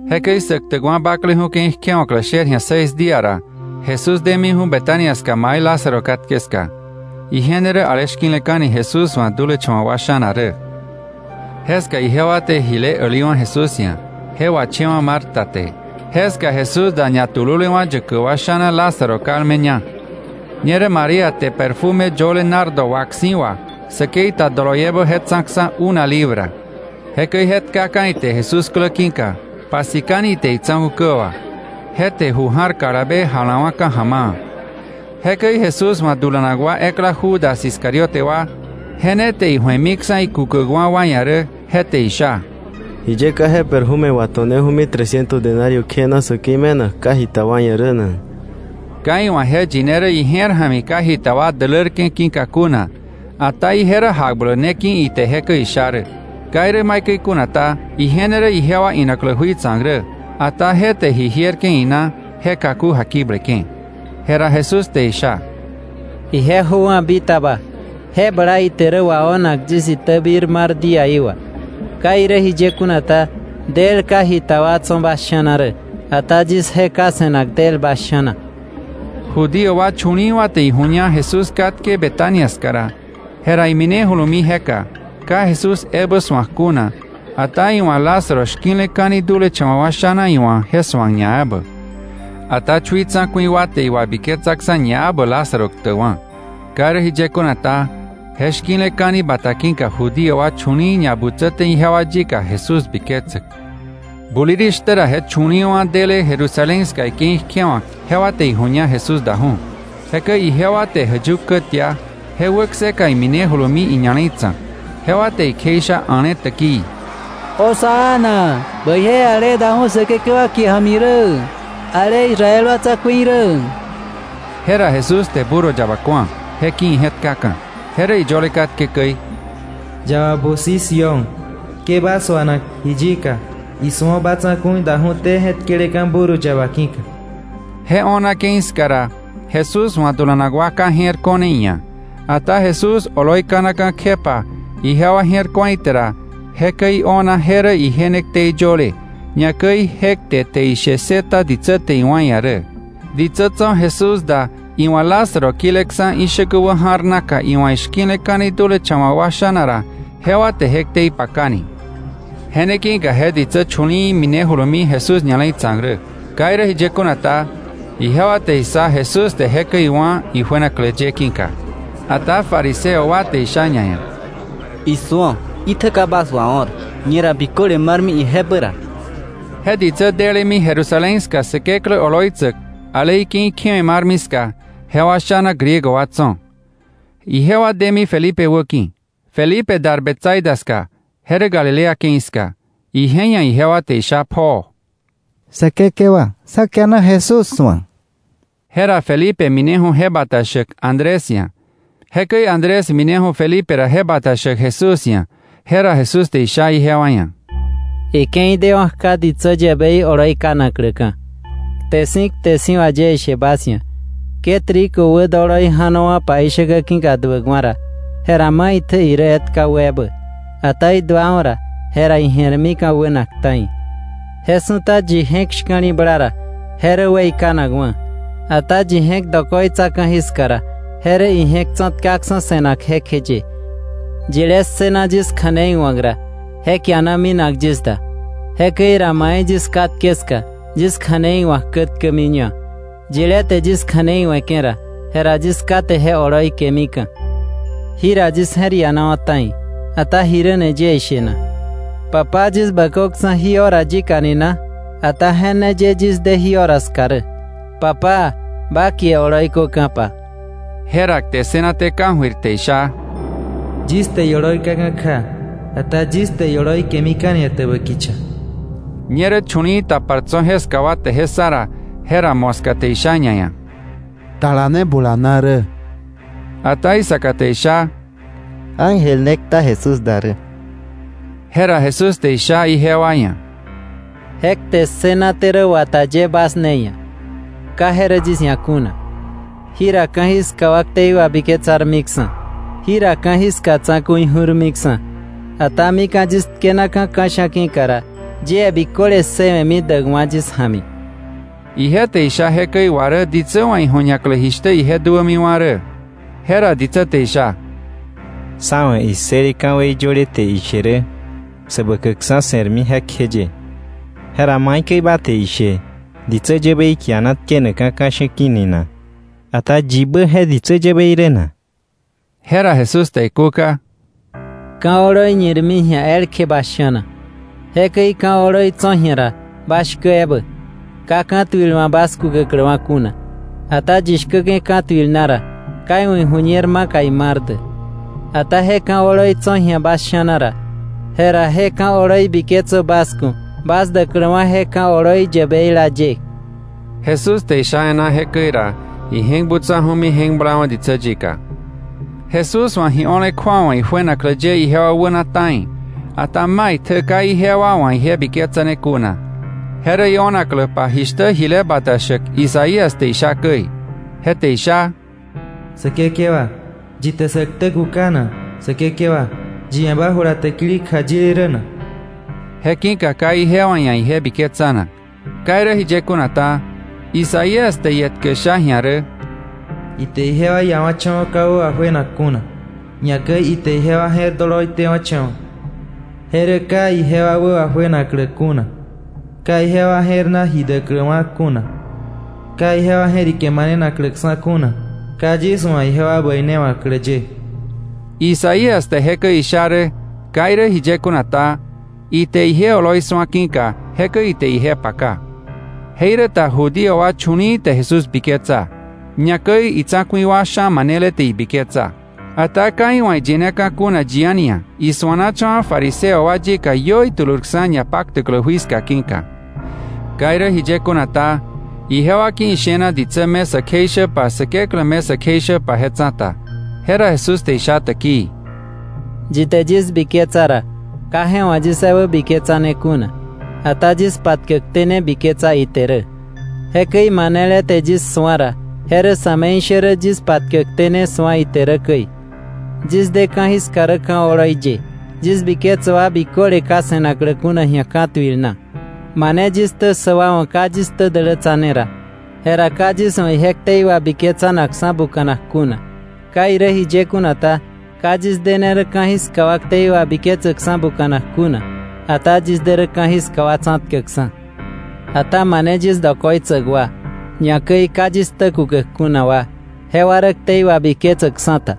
Jekäi Säktäkwa̱ Bakleju̱ ke̱i kjewa̱klä sher ji̱a seis día ra, Jesús demiju̱ Betania ska mai Lázaro katke ska. Ije ne rä ale shki̱leka̱ni Jesús wa̱ dulecha̱wa̱ wa sha̱na rä. Jeska ijewa te jile äliwa̱ Jesús ia̱. Je wachewa̱ Marta te. Jeska Jesús da ñatululewa̱ yäkäk wa sha̱na Lázaro kalmeña. Ñerä María te perfume yöle nardo wak si̱ wà säkei ta doloiebä je tsa̱ksa̱ una libra. Jekäi je tkaka̱ ite Jesús klä ki̱ka, pasikani ite itsa̱ku̱ kä wà. Je te ju ja̱r kalabe jalawa̱ka̱ ja̱ma̱a̱. Jekäi Jesús wa̱ dulanak wa ekla Judas Iscariote wa, je ne te iju̱emiksa̱ ikukäkwa̱ wa ia̱ rä, je te isha: —¿Jiye ka je perfume wato̱neju̱mi tresciento denario kjena säkei me̱nak ka jita wa ia̱ rä na? Ka iwa̱ je yine rä ije̱r ja̱mi ka jita wa dälärke̱ ki̱ka kuna, ata ije rä jakbläk ne ki̱ ite jekäi isha rä. Ka irä maikäi kuna ta, ije ne rä ijewa inaklä jui tsa̱k rä, ata je te ijierke̱ ina je kaku jakibleke̱. Jera Jesús te isha: —Ije jöwa̱ bitaba. Je bla ite rä wao̱nak yis itäbir mar díaí wà. Ka irä jiye kuna ta, del ka jita wa tso̱ bas sha̱na rä, ata yis je ka se̱nak del bas sha̱na. Judío wa chu̱li̱i̱wa̱ te iju̱ña Jesús katke Betania ska ra, jera iminejulumi jeka, ka Jesús ebä su̱ak kuna, ata iwa̱ Lázaro shki̱leka̱ni dulecha̱wa̱ wa sha̱na iwa̱ je su̱ak ñaebä. Ata chui tsa̱ku̱i wa te iwabiketsaksa̱ ñaebä Lázaro ktäkwa̱. Ka irä jiye kuna ta, je shki̱leka̱ni bata ki̱ka Judío wa chu̱li̱i̱ ñabutsäte ijewa yika Jesús biketsäk. Bulirishtä ra je chu̱li̱i̱wa̱ dele Jerusalén ska ike̱i kjewa̱k jewa te iju̱ña Jesús daju̱. Jekäi ijewa te jäyuk kä tia, je wäkseka iminejulumi iña̱le̱i tsa̱k. Jewa te ikjeisha a̱le täkii: “¡Hosana! Bäije ale daju̱ Säkekewa kie ja̱mi rä, ale Israel wa tsa̱ku̱i rä.” Jera Jesús te burro yaba ku̱a, je ki̱ ije̱tkaka̱. Je rä iyöle katke käi: “Yaba busi Sión, ke ba suana ji yika; isu̱o, ba tsa̱ku̱i daju̱té je̱tkeleka̱ burro yaba ki̱ka.” Je o̱na ke̱i ska ra Jesús wa̱ dulanak wa ka je̱r ko̱ne iia̱. Ata Jesús oloi kanaka̱ kjepa ijewa je̱r ku̱a ite ra jekäi io̱na je rä ije ne ktei yöle, ñakäi je kte te ishe ssëta ditsä te iwa̱ iia̱ rä. Ditsä tso̱ Jesús da iwa̱ Lázaro kileksa̱ ishäkä wäja̱r naka iwa̱ ishki̱leka̱ni dulecha̱wa̱ wa sha̱na ra, jewa te je ktei pakani. Je ne ki̱ka je ditsä chu̱li̱i̱ minejulumi Jesús ña̱le̱i tsa̱k rä. Ka irä jiye kuna ta, jewa te issa Jesús te jekäi iwá̱ ijuenaklä ye ki̱ka. Ata fariseo wa te isha ñaia̱: —¡Isu̱o! Itjä ka bas wao̱r. Ñera biköle marmi ijebä ra. Je ditsä delemi Jerusalén ska Säkeklä oloitsäk ale ike̱i kjewe̱ marmi ska, jewa sha̱na Griego wa tso̱. Ijewa demi Felipe wäki̱. Felipe dar Betsaida ska, je rä Galilea ke̱i ska. Ije ia̱ ijewa te isha pjoo: —Säkekewa, sá kiana Jesús su̱ak. Jera Felipe mineju̱ je bata shäk Andrés ia̱. Jekäi Andrés mineju̱ Felipe ra je bata shäk Jesús ia̱. Jera Jesús te isha ijewa ia̱: —Ike̱i dewa̱ kja ditsä yäbei oloi kanakläka̱. Kte si̱ kte si̱ wà yie ishe bas ia̱, ke trigo wädoloi ja̱nowa̱pa ishäkä ki̱ka duäkwa̱ ra, jera maitjä irä etka wä ebä. Ata iduawa̱ ra, jera ije̱rmika̱ wänak ta̱i. Je su̱ta yi je̱k shka̱li̱bla ra, je rä weikanakwa̱. Ata yi je̱k dokoitsa ka̱jiska ra, je rä ije̱k tsa̱tkaksa̱ se̱nak jekjeye. Yilé ssëna yis kja̱nei wa̱k ra, je kiana minak yis da. Jekäi ra mai yis katke ska, yis kja̱nei wa̱k kätkämiña. Yilé te yis kja̱nei we̱ke̱ ra, jera yis Ká te je oloi kemika̱. “Jira yis je̱r ianawa̱ ta̱i. ¿Ata jiräni yie ishe na? ‘¿Papá, yis bäköksa̱ jí hora yika ni na?’ Ata je ne ye yis de jí hora ska rä. Papá, ba kie oloi köka̱pa.” Jera kte ssënaté ka̱jöir, te isha: —Yis te ioloi kaka̱ kja, ata yis te ioloi kemika̱ni etäbä kicha. Ñerä chu̱li̱i̱ tapar tso̱ jeska wa te je ssa ra, jera moska te isha ñaia̱: —Tala ne bulana rä. Ata isaka te isha: —Ángel ne kta Jesús da rä. Jera Jesús te isha ijewa ia̱: —Je kte ssënaté rä wata ye bas ne ia̱; ka je rä yis ia̱ kuna. Jira ka̱jiska wa ktei wabiketsarmiksa̱, jira ka̱jiska tsa̱ku̱i ju̱rmiksa̱. Ata mika̱ yis tkenaka̱ ka̱sha̱ ki̱ka ra, yie biköle ssëwe̱mi däkwa̱ yis ja̱mi. Ije te isha jekäi wà rä ditsä wa̱ iju̱ñaklä jishtä ije duämiwa̱ rä. Jera ditsä te isha: —Sá wa̱ issële ka̱wei yöle te ishe rä Säbäkäkksa̱ se̱rmi rä jekjeye. ¿Jera maikäi ba te ishe ditsä yäbei kiana tkenakka̱ ka̱sha̱ ki̱ ni na? Ata yibä je ditsä yäbei rä na? Jera Jesús te ikúka: —Ka̱ oloi ñirmi ji̱a elkje bas sha̱na. Jekäi ka̱ oloi tso̱ ji̱a ra, bas shkä ebä, ka ka̱tuil wa̱ bas kukäkläwa̱ kuna. Ata yi shkäke̱ ka̱tuil na ra, ka iwa̱ iju̱ñer maka imar dä. Ata je ka̱ oloi tso̱ ji̱a bas sha̱na ra, jera je ka̱ oloi biketsö bas ku̱ bas däkläwa̱ je ka̱ oloi yäbeila ye. Jesús te isha e̱ná jekäi ra, ije̱k butsaju̱mi je̱k blawa̱ ditsä yika. Jesús wa̱ ji o̱le kju̱awa ijuenaklä ye ijewa wäna ta̱i, ata maitjä ka ijewa wa̱ je biketsane kuna. Je rä io̱nakläpa jishtä jile bata shäk Isaías te isha käi. Je te isha: “Säkekewa, ¿yi te sä ktä kuka na? Säkekewa, ¿yi ia̱ ba jula täkili kjayile rä na?” Je ki̱ka ka ijewa ia̱ ije biketsanak. Ka irä jiye kuna ta, Isaías te ietkä sha ji̱a rä: “Ite ijewa iawa̱cha̱wa̱ ka wä wajuenak kuna, ñakäi ite ijewa je̱r doloi tewa̱cha̱wa̱. Je rä ka ijewa wä wajuenaklä kuna, ka ijewa je̱r na ji däkläwa̱ kuna, ka ijewa je̱rike manenakläksa̱ kuna, ka yis wa̱ ijewa bäinewa̱klä ye.” Isaías te jekäi isha rä. Ka irä jiye kuna ta, ite ije oloi su̱a ki̱ka, jekäi ite ije paka. Jeiräta Judío wa chu̱li̱i̱ te Jesús biketsa. Ñakäi itsa̱ku̱i wa sha̱ manele te ibiketsa. Ata ka iwa̱ iyineka̱ kuna yi a̱ni ia̱, isuanacha̱wa̱ fariseo wa yika iö itulurksa̱ ñapaktäklä jui ska ki̱ka. Ka irä jiye kuna ta, ijewa ki̱ ishena ditsä me sä kjeishäpa Säkeklä me sä kjeishäpa je tsa̱ta. Jera Jesús te isha täkii: “Yi te yis biketsa ra, ka je wa̱ yis ebä biketsane kuna, ata yis patkäkté ne biketsa ite rä. Jekäi manele te yis su̱a ra, je rä sa̱me̱ishärä yis patkäkté ne su̱a ite rä käi. Yis de ka̱jiska rä ka̱ oloi ye, yis biketsäk wa biköle ka se̱naklä kuna ji̱a ka̱tuil na. Mane yis ktä ssäk wa wa̱ ka yis ktä dälätsane ra, jera ka yis wa̱ ije ktei wabiketsanaksa̱ buka̱nak kuna. Ka irä jiye kuna ta, ka yis de ne rä ka̱jiska wa ktei wabiketsäkksa̱ buka̱nak kuna, ata yis de rä ka̱jiska wa tsa̱tkäkksa̱. Ata mane yis dokoitsäk wa, ñakäi ka yis ktä kukäk kuna wa, jewa rä ktei wabiketsäkksa̱ ta.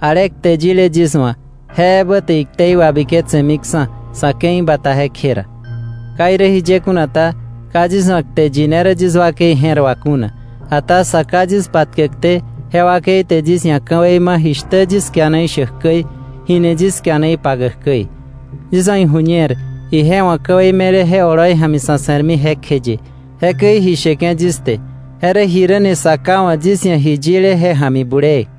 Ale kte yile yis wa̱; je ebä te iktei wabiketsemiksa̱ sa̱ ke̱i bata jekje ra. Ka irä jiye kuna ta, ka yis wa̱ kte yine rä yis wakei je̱r wà kuna, ata Sa Ká yis patkäkté je wakei te yis ia̱ ka̱wei ma̱ jishtä yis kiana ishäk käi, jini yis kiana ipakäk käi. Yis wa̱ iju̱ñer ije wa̱ ka̱wei me̱le je oloi ja̱mi sa̱ se̱rmi jekjeye, jekäi ji sheke̱ yis te je rä jiräni Sa Ká wa̱ yis ia̱ ji yile je ja̱mi bulee.”